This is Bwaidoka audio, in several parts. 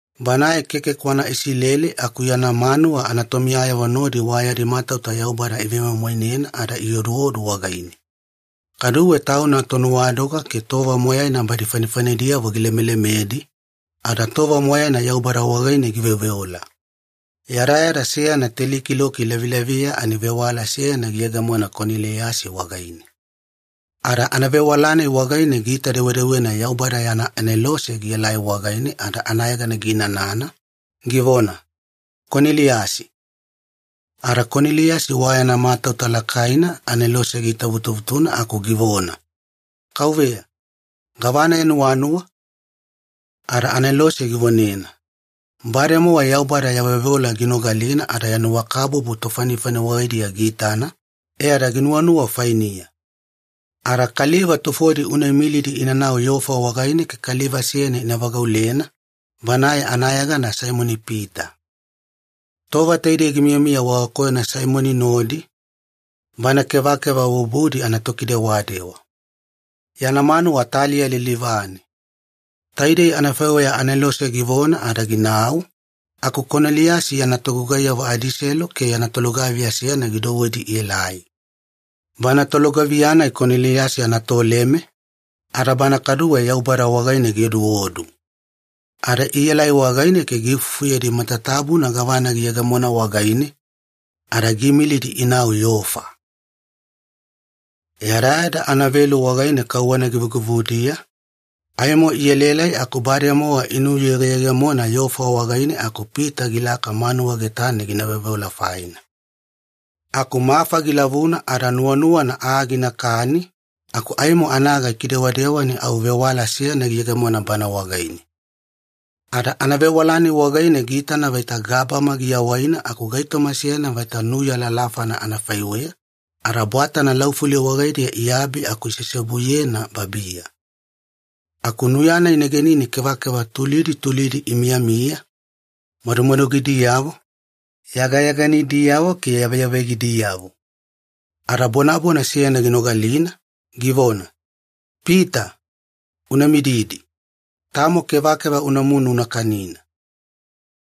Banae keke kwana Isileli aku yana manuwa anatomiyayavo nodi wa yadi matauta Yaubada ivemoimoinena ada ioduodu wagaine. Kaduwe tauna tonuwadoga ke tova moyaina badi fanifanidiyavo gilemelemedi, ada tova moyaina Yaubada wagaine giveoveola. Yadayada seyana teli kiloki lavilaviya ani vewala seyana giyegemona Koneliyasi wagaine. Ada anavewala-nai wagaine giita-dewedewena Yaubada yana anelose gielai wagaine ada anayegana giinanana, givona, “Koneliyasi.” Ada Koneliyasi wa yana matauta lakaina anelose giitavutuvutuna aku givona, “Kauveya, gavana ya nuwanuwa?” Ada anelose givonena, “Bademowa Yaubada ya veoveola ginogalina ada ya nuwakabubu tofanifani wagaidiya giitana, e ada ginuwanuwa fainiya. Ada kaliva tufodi una imilidi inanau Yofa wagaine ke kaliva seyana ina vagaulena, banae anayegana Saimoni-Pita. Tova taidei gimiyamiya wagakoyona Saimoni nodi, bana kevakeva bubudi anatokidewadewa. Yana manuwa taliya lilivane.” Taidei anafaiweya anelose givona ada ginau, aku Koneliyasi yana togugaiyavo adiselu ke yana tolugaviya seyana gidouwedi ielai. Bana tolugaviya-nai Koneliyasi anatoleme, ada bana kaduwe Yaubada wagaine gioduodu. Ada ielai wagaine ke giifufuyedi matatabuna gavana giyegemona wagaine, ada giimilidi inau Yofa. Yadayada anavelu wagaine kauwana givugivudiya, aimo ielaelai aku bademowa inuyegeyegemona Yofa wagaine aku Pita gilaka manuwa getane gina veoveola faina. Aku mafa gilavuna ada nuwanuwana aa ginakani, aku aimo anaga ikidewadewa ani au vewala seyana giyegemona bana wagaine. Ada anavewala-nai wagaine giitana vaita gabama giawaina aku gaitoma seyana vaita nuya lalafana anafaiweya, ada bwatana laufuli wagaidiya iabi aku iseseobuyena babiya. Aku nuya-nai negenine kevakeva tulidi tulidi imiyamiya, madumadugidiyavo, yagayaganidiyavo ke yaveyavegadiyavo. Ada bonabona seyana ginogalina, givona, “Pita, una mididi. Tamo kevakeva unamunu una kanina.”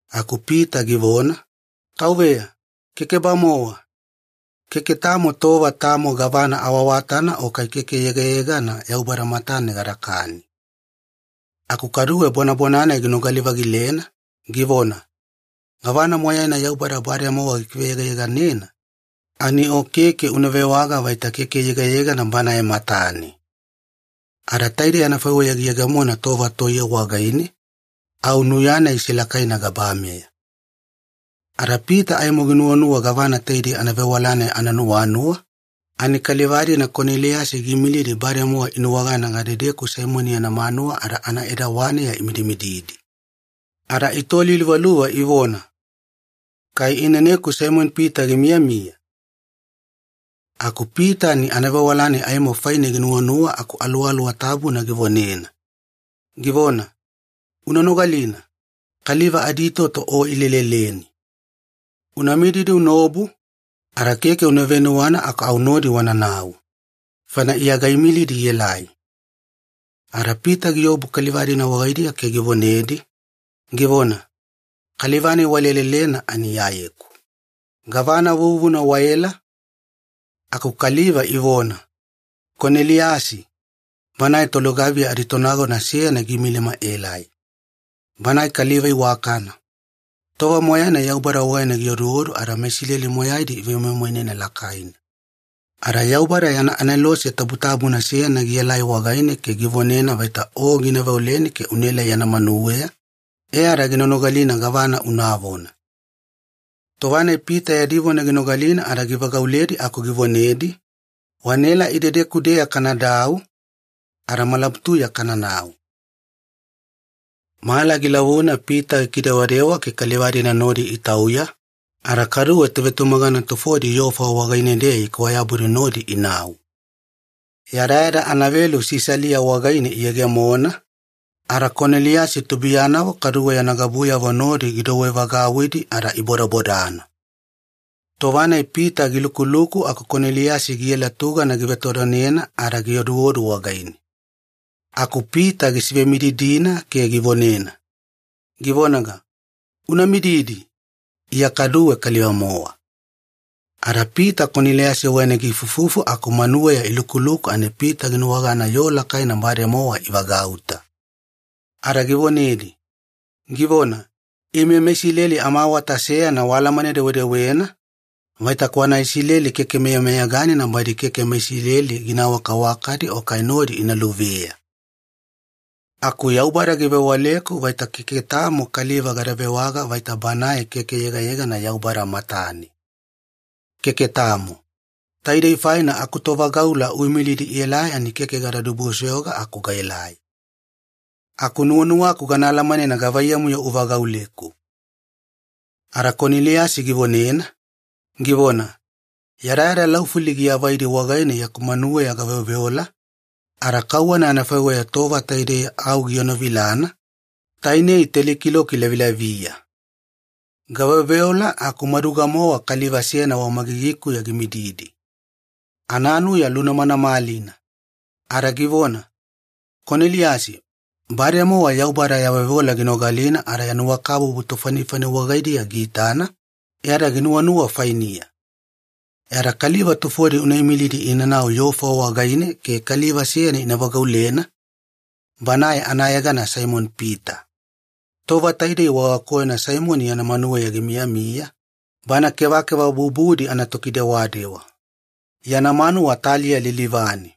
Aku Pita givona, “Kauveya, keke-bamowa! Keke tamo tova tamo gavana awaawatana o kai keke yegayegana Yaubada matane gadakani.” Aku kaduwe bonabona-nai ginogali-vagilena, givona, “Gavana moyaina Yaubada bademowa gikiveyegayeganena, ani o keke una vewaga vaita keke yegayegana Banae matane.” Ada taidei anafaiweya giyegemona tova toiye wagaine, au nuya-nai isilakaina gabameya. Ada Pita aimo ginuwanuwa gavana taidei anavewala-nai ananuwanuwa, ani kaliva-dina Koneliyasi giimilidi bademowa inuwagana gadedeku Saimoni yana manuwa ada anaedawaneya imididina. Ada itoliluvaluva ivona, “Kai ineneku Saimoni-Pita gimiyamiya?” Aku Pita ani anavewala-nai aimo faine ginuwanuwa aku Aluwaluwa Tabuna givonena, givona, “Una nogalina, kaliva aditoto o ileleleni. Una mididi unaobu, ada keke una venuwana aku au nodi wananau. Faina Iya gaimilidi ielai.” Ada Pita giobu kaliva-dina wagaidiya ke givonedi, givona, “Kaliva-nai walelelena ani Iyayeku. Gavana vuvuna waela?” Aku kaliva ivona, “Koneliyasi, banae tolugaviya aditonagona seyana giimilima aelai. Banae kaliva iwakana. Tova moyaina Yaubada wagaine gioduodu ada meIsileli moyaidi ivemoimoinena lakaina. Ada Yaubada yana anelose tabutabuna seyana gielai wagaine ke givonena vaita o gina veoleni ke unaelai yana manuweya, e ada gina nogalina gavana unavona.” Tova-nai Pita yadi vona ginogalina ada givagauledi aku givonedi, “Wanaela idedeku-deya kanadau, ada malabutuya kananau.” Mala gilavuna Pita gikidewadewa ke kaliva-dina nodi itauya, ada kaduwe tovetumagana tufodi Yofa wagaine-deya ikwayabudi nodi inau. Yadayada anavelu Sisalia wagaine iyegemona, ada Koneliyasi tubuiyanavo kaduwe yana gabuyavo nodi gidouwevagauwidi ada ibodabodana. Tova-nai Pita gilukuluku aku Koneliyasi giela tugana givetodonena ada gioduodu wagaine. Aku Pita gisivemididina ke givonena, givonaga, “Una mididi! Iya kaduwe kaliva-mowa.” Ada Pita Koneliyasi wagaine giifuifufu aku manuweya ilukuluku ani Pita ginuwagana yoo lakaina bademowa ivagauta. Ada givonedi, givona, “Ime meIsileli amaawata seyana waalamane-dewedewena, vaita kwana Isileli keke meyameyaganina badi keke meIsileli gina awakawakadi o kai nodi ina luveya. Aku Yaubada givewaleku vaita keke tamo kaliva gada vewaga vaita banae keke yegayegana Yaubada matane. Keke tamo. Taidei faina akutovagaula uimilidi ielai ani keke gada dibusoyoga aku gaelai. Aku nuwanuwaku gana alamanena gavaiyamu-yo uvagauleku.” Ada Koneliyasi givonena, givona, “Yadayada laufuli giavaidi wagaine yaku manuweya gaveoveola, ada kauwana anafaiweya tova taidei au gienovilana, tainei teli kiloki lavilaviya. Gaveoveola aku maduga-mowa kaliva seyana wamagigikuya gimididi. Ananuya lunamanamalina. Ada givona, ‘Koneliyasi, bademowa Yaubada ya veoveola ginogalina ada ya nuwakabubu tofanifani wagaidiya giitana, e ada ginuwanuwa fainiya. E ada kaliva tufodi una imilidi inanau Yofa wagaine ke kaliva seyana ina vagaulena, banae anayegana Saimoni-Pita. Tova taidei wagakoyona Saimoni yana manuweya gimiyamiya, bana kevakeva bubudi anatokidewadewa. Yana manuwa taliya lilivane.’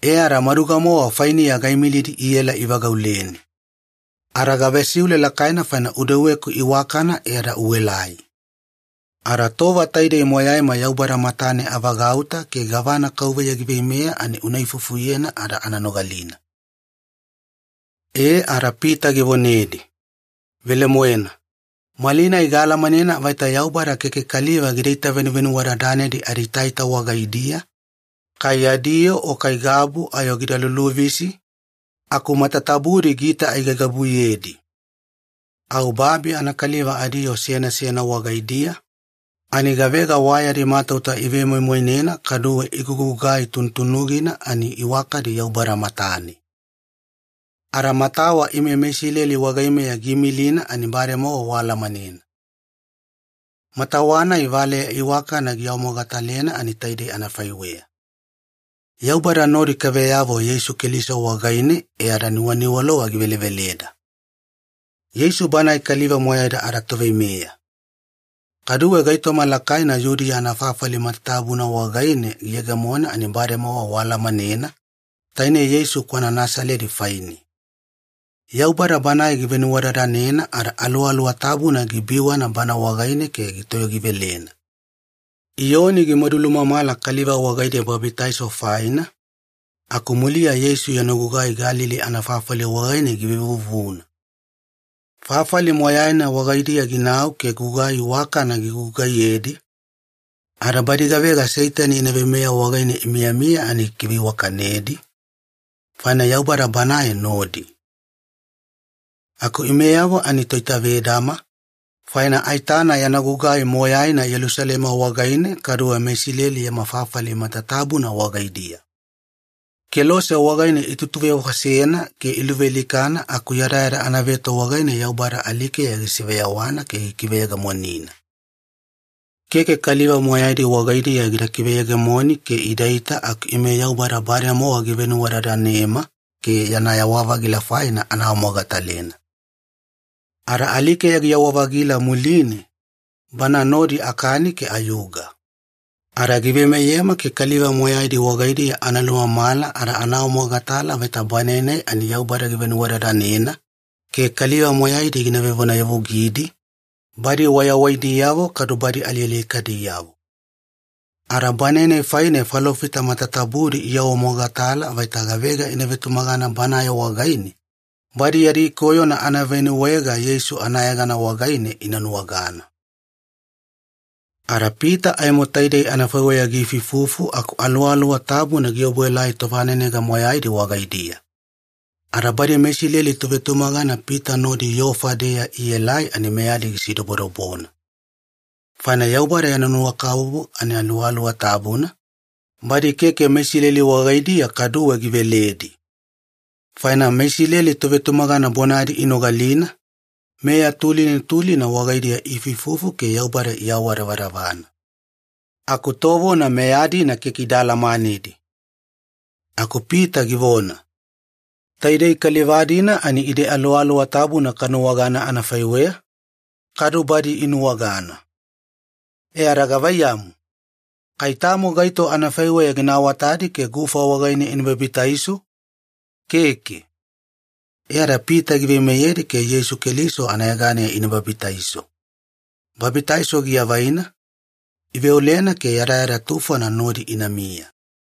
E ada maduga-mowa fainiya gaimilidi iela ivagauleni. Ada gavesiule lakaina faina udeweku iwakana e ada uelai. Ada tova taidei moyaima Yaubada matane avagauta ke gavana Kauveya giveimeya ani una ifufuyena ada ana nogalina.” E ada Pita givonedi, “Velemoena, malinai gaalamanena vaita Yaubada keke kaliva gidaita venuvenuwadadanedi adiitaita wagaidiya, kai yadi yoo o kai gabu ayo gida luluvisi, aku matatabudi giita aigaigabuyedi. Au babi anakaliva adiyoo seyana seyana wagaidiya, ani gavega wa yadi matauta ivemoimoinena kaduwe igugugai tunutunugina ani iwakadi Yaubada matane. Ada matawa ime meIsileli wagaimeya giimilina ani bademowa waalamanena. Matawa-nai valeya iwakana giawamogatalena ani taidei anafaiweya. Yaubada nodi kaveyavo Yeisu Keliso wagaine e ada nuwaniwalova giveleveleda. Yeisu Banae kaliva moyaida adaToveimeya. Kaduwe gaitoma lakaina Yudiya anafafali matatabuna wagaine giyegemona ani bademowa waalamanena, tainei Yeisu kwana Nasaledi faine. Yaubada Banae givenuwadadanena ada Aluwaluwa Tabuna gibiwana Bana wagaine ke gitoyogivelena. Iyoni gimadulumamala kaliva wagaidiya babitaiso faina, aku muliya Yeisu yana gugai Galili anafafali wagaine givevuvuna. Fafali moyaina wagaidiya ginau ke gugai iwakana gigugugaiyedi, ada badi gavega Seitani yana veimeya wagaine imiyamiya ani gikiveiwakanedi, faina Yaubada Banae nodi. “Aku imeyavo ani toitavedama, faina aitana yana gugai moyaina Yelusalema wagaine, kaduwe meIsileli yama fafali matatabuna wagaidiya. Kelose wagaine itutuvefosena ke iluvealikana aku yadayada anaveto wagaine Yaubada alikeya gisiveyawana ke gikiveyegemonina. Keke kaliva moyaidi wagaidiya gida kiveyegemoni ke idaita, aku ime Yaubada bademowa givenuwadadanema ke yana yawa-vagila faina ana awamogatalena. Ada alikeya giyawa-vagila muline, Bana nodi akani ke ayuga. Ada giveimeyema ke kaliva moyaidi wagaidiya ana lumamala ada ana awamogatala vaita Banae-nai ani Yaubada givenuwadadanena, ke kaliva moyaidi gina vevonayavugidi, badi wayawaidiyavo kadu badi alialikadiyavo. Ada Banae-nai faine falofita matatabudi iawamogatala vaita gavega ina vetumagana Banae wagaine, badi yadi koyona anavenuwaega Yeisu anayegana wagaine ina nuwagana.” Ada Pita aimo taidei anafaiweya giifuifufu aku Aluwaluwa Tabuna giobuelai tovanenega moyaidi wagaidiya. Ada badi meIsileli tovetumagana Pita nodi Yofa-deya ielai ani meyadi gisidobodobona. Faina Yaubada yana nuwakabubu ani Aluwaluwa Tabuna, badi keke meIsileli wagaidiya kaduwe giveledi. Faina meIsileli tovetumagana bonadi inogalina, meya tulina tulina wagaidiya iifuifufu ke Yaubada iawadavadavana. Aku tovona meya-dina keke ida alamanedi. Aku Pita givona, “Taidei kaliva-dina ani ide Aluwaluwa Tabuna kanuwagana anafaiweya, kadu badi inuwagana. E ada gavaiyamu, kai tamo gaito anafaiweya gina awatadi ke gufa wagaine ina babitaiso? Keke.” E ada Pita giveimeyedi ke Yeisu Keliso anayeganeya ina babitaiso. Babitaiso giavaina, iveolena ke yadayada tufona nodi inamiya.